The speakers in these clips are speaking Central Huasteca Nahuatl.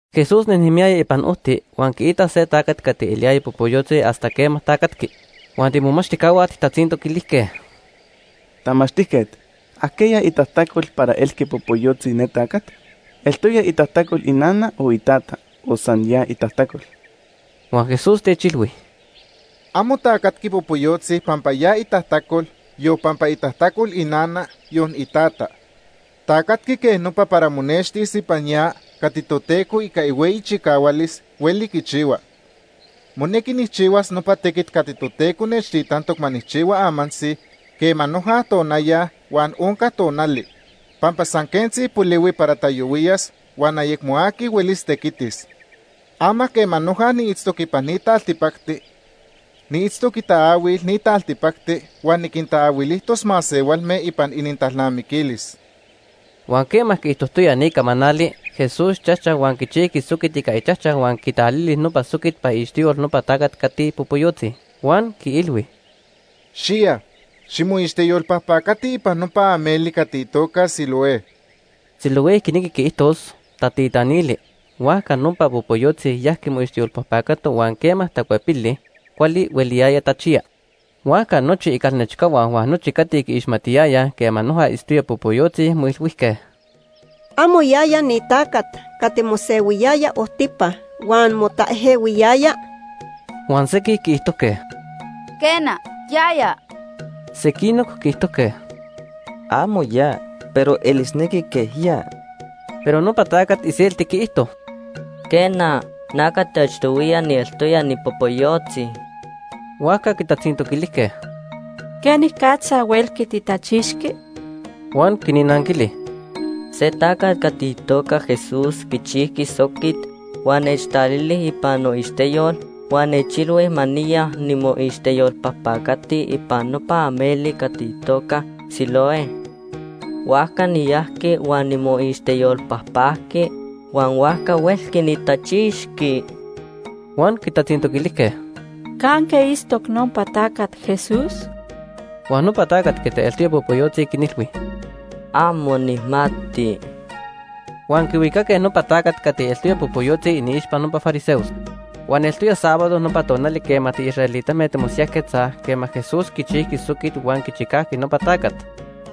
Jesús nejnemiyaya ipan ojti, huan quiitac se tacat cati eliyaya popoyotzi hasta quema tacatqui. Huan tiimomachtijcahua tijtatzintoquilijque: ―Tamachtijquet, ¿ajquiya itajtacol para elqui popoyotzi ne tacat? ¿Eltoya itajtacol inana o itata o san ya itajtacol? Huan Jesús techilhui: ―Amo tacatqui popoyotzi pampa ya itajtacol, yon pampa itajtacol inana, yon itata. Tacatqui quej nopa para monextis ipan ya cati Toteco ica ihueyi chicahualis hueli quichihua. Monequi nijchihuas nopa tequit cati Toteco nechtitantoc ma nijchihua amantzi quema noja tonaya huan onca tonali, pampa san quentzi polihui para tayohuiyas huan ayecmo aqui huelis tequitis. Ama quema noja niitztoc ipan ni taltipacti, niitztoc itaahuil ni taltipacti huan niquintaahuilijtos masehualme ipan inintalnamiquilis. Huan quema quiijtojtoya ni camanali, Jesús chajchac huan quichijqui soquit ica ichajchac huan quitalili nopa soquit ipan iixteyol nopa tacat cati popoyotzi. Huan quiilhui: ―Xiya, ximoixteyolpajpacati ipan nopa ameli cati itoca Siloé. (Siloé quinequi quiijtos: ‘Tatitanili’.) Huajca nopa popoyotzi yajqui moixteyolpajpacato huan quema tacuepili, cuali hueliyaya tachiya. Huajca nochi icalnechcahua huan nochi cati quiixmatiyayaj quema noja itztoya popoyotzi moilhuijque: ―¿Amo yaya ni tacat cati mosehuiyaya ojtipa huan motaejehuiyaya? Huan sequij quiijtojque: ―Quena, yaya. Sequinoc quiijtojque: ―Amo ya, pero elisnequi quej ya. Pero nopa tacat iselti quiijto: ―Quena, na cati achtohuiya nieltoya nipopoyotzi. Huajca quitatzintoquilijque: ―¿Quenicatza huelqui titachixqui? Huan quinnanquili: ―Se tacat cati itoca Jesús quichijqui soquit, huan nechtalili ipan noixteyol huan nechilhui ma niya nimoixteyolpajpacati ipan nopa ameli cati itoca Siloé. Huajca niyajqui huan nimoixteyolpajpajqui huan huajca huelqui nitachixqui. Huan quitatzintoquilijque: ―¿Canque itztoc nopa tacat Jesús? Huan nopa tacat cati eltoya popoyotzi quinilhui: ―Amo nijmati. Huan quihuicaque nopa tacat cati eltoya popoyotzi iniixpa nopa fariseos. Huan eltoya sábado nopa tonali quema tiisraelitame timosiyajquetzaj quema Jesús quichijqui soquit huan quichicajqui nopa tacat,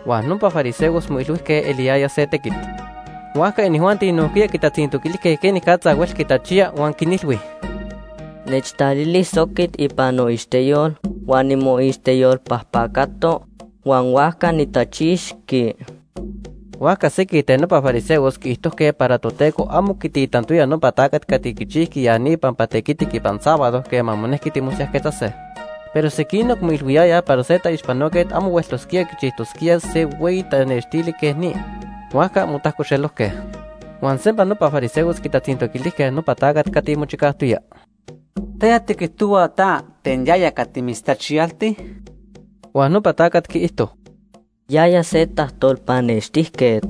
huan nopa fariseos moilhuijque eliyaya se tequit. Huajca inijuanti nojquiya quitatzintoquilijque quenicatza huelqui tachiya. Huan quinilhui: ―Nechtalili soquit ipan noixteyol huan nimoixteyolpajpacato, huan huajca nitachixtehua. Huajca sequij ten nopa fariseos quiijtojque para Toteco amo quititantoya nopa tacat cati quichijqui ya ni pampa tequitic ipan sábado quema monequi timosiyajquetzase. Pero sequinoc moilhuiyayaj para se taixpanoquet amo hueltosquía quichijtosquía se hueyi tanextili quej ni. Huajca motajcoxelojque. Huan sempa nopa fariseos quitatzintoquilijque nopa tacat cati mochicajtoya: ―¿Taya tiquijtohua ta ten yaya cati mitztachiyalti? Huan nopa tacat quiijto: ―Yaya se tajtolpanextijquet.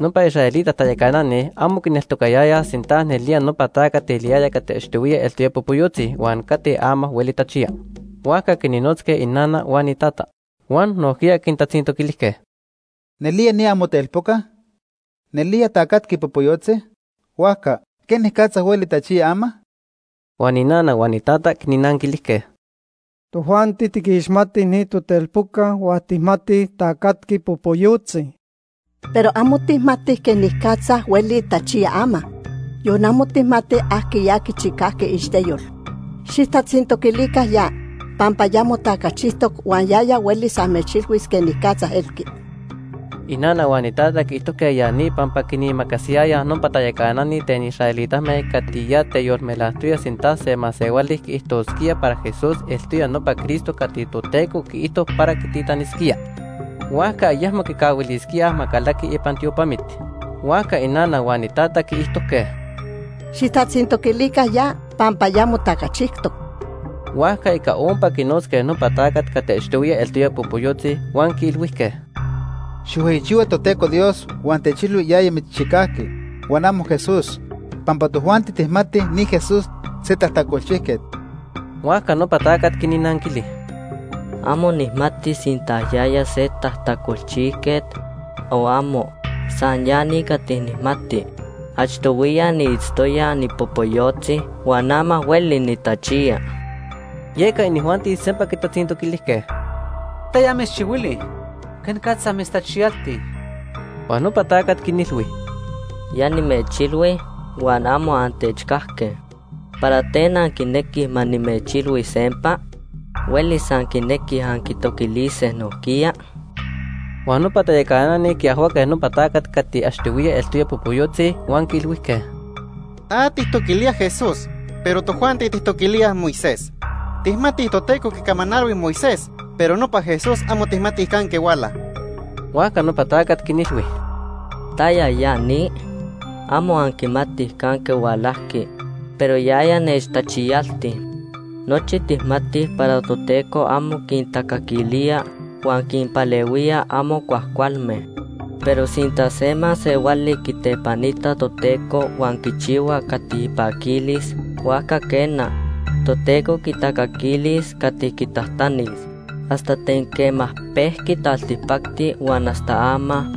Nopa israelita tayacanani amo quineltocayayaj sinta nelía nopa tacat eliyaya cati achtohuiya eltoya popoyotzi huan cati ama hueli tachiya, huajca quinnotzque inana huan itata. Huan nojquiya quintatzintoquilijque: ―¿Nelía, ni amotelpoca? ¿Nelía tacatqui popoyotzi? Huajca, ¿quenicatza hueli tachiya ama? Huan inana huan itata quinnanquilijque: ―Tojuanti tiquixmatij ni totelpoca huan tijmatij tacatqui popoyotzi. Pero amo tijmatij quenicatza hueli tachiya ama, yon amo tijmatij ajquiya quichicajqui iixteyol. Xijtatzintoquilica ya, pampa ya motacachijtoc huan yaya huelis amechilhuis quenicatza elqui. Inana huan itata quiijtojque ya ni pampa quinimacasiyayaj nopa tayacanani ten israelitame cati ya teyolmelajtoyaj sinta se masehuali quiijtosquía para Jesús eltoya nopa Cristo cati Toteco quiijto para quititanisquía, huajca ayecmo quicahuilisquíaj ma calaqui ipan tiopamit. Huajca inana huan itata quiijtojque: ―Xijtatzintoquilica ya, pampa ya motacachijtoc. Huajca ica ompa quinotzque nopa tacat cati achtohuiya eltoya popoyotzi huan quiilhuijque: ―Xijhueyichihua Toteco Dios huan techilhui yaya mitzchicajqui, huan amo Jesús, pampa tojuanti tijmatij ni Jesús se tajtacolchijquet. Huajca nopa tacat quinnanquili: ―Amo nijmati sinta yaya se tajtacolchijquet o amo. San ya ni cati nijmati. Achtohuiya niitztoya nipopoyotzi huan ama hueli nitachiya. Yeca inijuanti sempa quitatzintoquilijque: ―¿Taya mitzchihuili? ¿Quenicatza mitztachiyalti? Huan nopa tacat quinilhui: ―Ya nimechilhui huan amo antechcajque. ¿Para ten anquinequij ma nimechilhui sempa? ¿Huelis anquinequij anquitoquilise nojquiya? Huan nopa tayacanani quiajhuaque nopa tacat cati achtohuiya eltoya popoyotzi huan quiilhuijque: ―Ta tijtoquilía Jesús, pero tojuanti tijtoquilíaj Moisés. Tijmatij Toteco quicamanalhui Moisés, pero nopa Jesús amo tijmatij canque huala. Huajca nopa tacat quinilhui: ―¿Taya ya ni? Amo anquimatij canque hualajqui, pero yaya nechtachiyalti. Nochi tijmatij para Toteco amo quintacaquilía huan quinpalehuía amo cuajcualme. Pero sinta se masehuali quitepanita Toteco huan quichihua cati ipaquilis, huajca quena, Toteco quitacaquilis cati quitajtanis. Hasta ten quema pehua taltipacti huan hasta ama,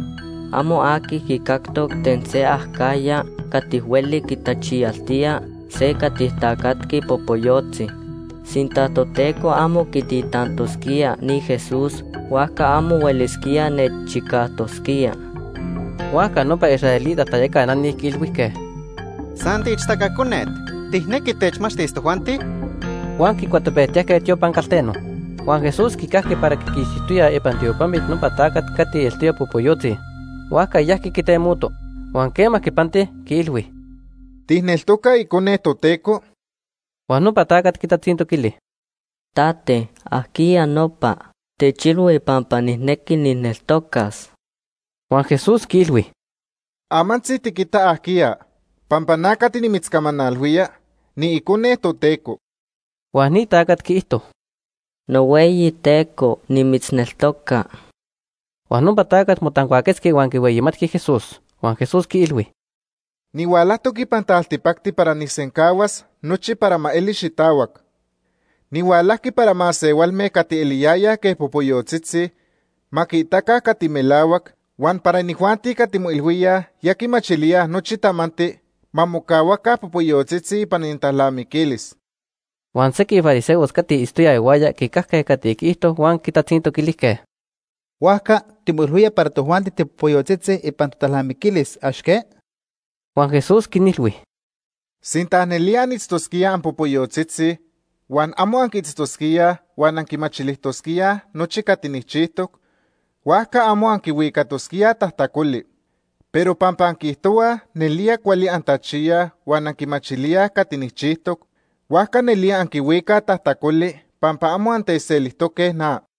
amo aqui quicactoc ten se acajya cati hueli quitachiyaltía se cati tacatqui popoyotzi. Sinta Toteco amo quititantosquía ni Jesús, huajca amo huelisquía nechchicajtosquía. Huajca nopa israelita tayacanani quiilhuijque: ―¡San tiixtaca conet! ¿Tijnequi techmachtis tojuanti? Huan quicuatopejtiyajque tiopan calteno. Huan Jesús quicajqui para quiquixtijtoyaj ipan tiopamit nopa tacat cati eltoya popoyotzi, huajca yajqui quitemoto. Huan quema quipanti, quiilhui: ―¿Tijneltoca Icone Toteco? Huan nopa tacat quitatzintoquili: ―Tate, ¿ajquiya nopa? Techilhui pampa nijnequi nijneltocas. Huan Jesús quiilhui: ―Amantzi tiquita ajquiya, pampa na cati nimitzcamanalhuía, niIcone Toteco. Huan ni tacat quiijto: ―NohueyiTeco, nimitzneltoca. Huan nopa tacat motancuaquetzqui huan quihueyimatqui Jesús. Huan Jesús quiilhui: ―Nihualajtoc ipan taltipacti para nijsencahuas nochi para ma eli xitahuac. Nihualajqui para masehualme cati eliyayaj quej popoyotzitzi ma quiitaca cati melahuac, huan para inijuanti cati moilhuíaj ya quimachilíaj nochi tamanti ma mocahuaca popoyotzitzi ipan inintalnamiquilis. Huan sequij fariseos cati itztoyaj ihuaya quicajque cati quiijto huan quitatzintoquilijque: ―Huajca timoilhuía para tojuanti tipopoyotzitzi ipan totalnamiquilis. ¿Amo que? Huan Jesús quinilhui: ―Sinta nelía anitztosquíaj anpopoyotzitzi huan amo anquiitztosquíaj huan anquimachilijtosquíaj nochi cati nijchijtoc, huajca amo anquihuicatosquíaj tajtacoli. Pero pampa anquiijtohuaj nelía cuali antachiyaj huan anquimachilíaj cati nijchijtoc, huajca nelía anquihuicaj tajtacoli pampa amo antechselijtoque na.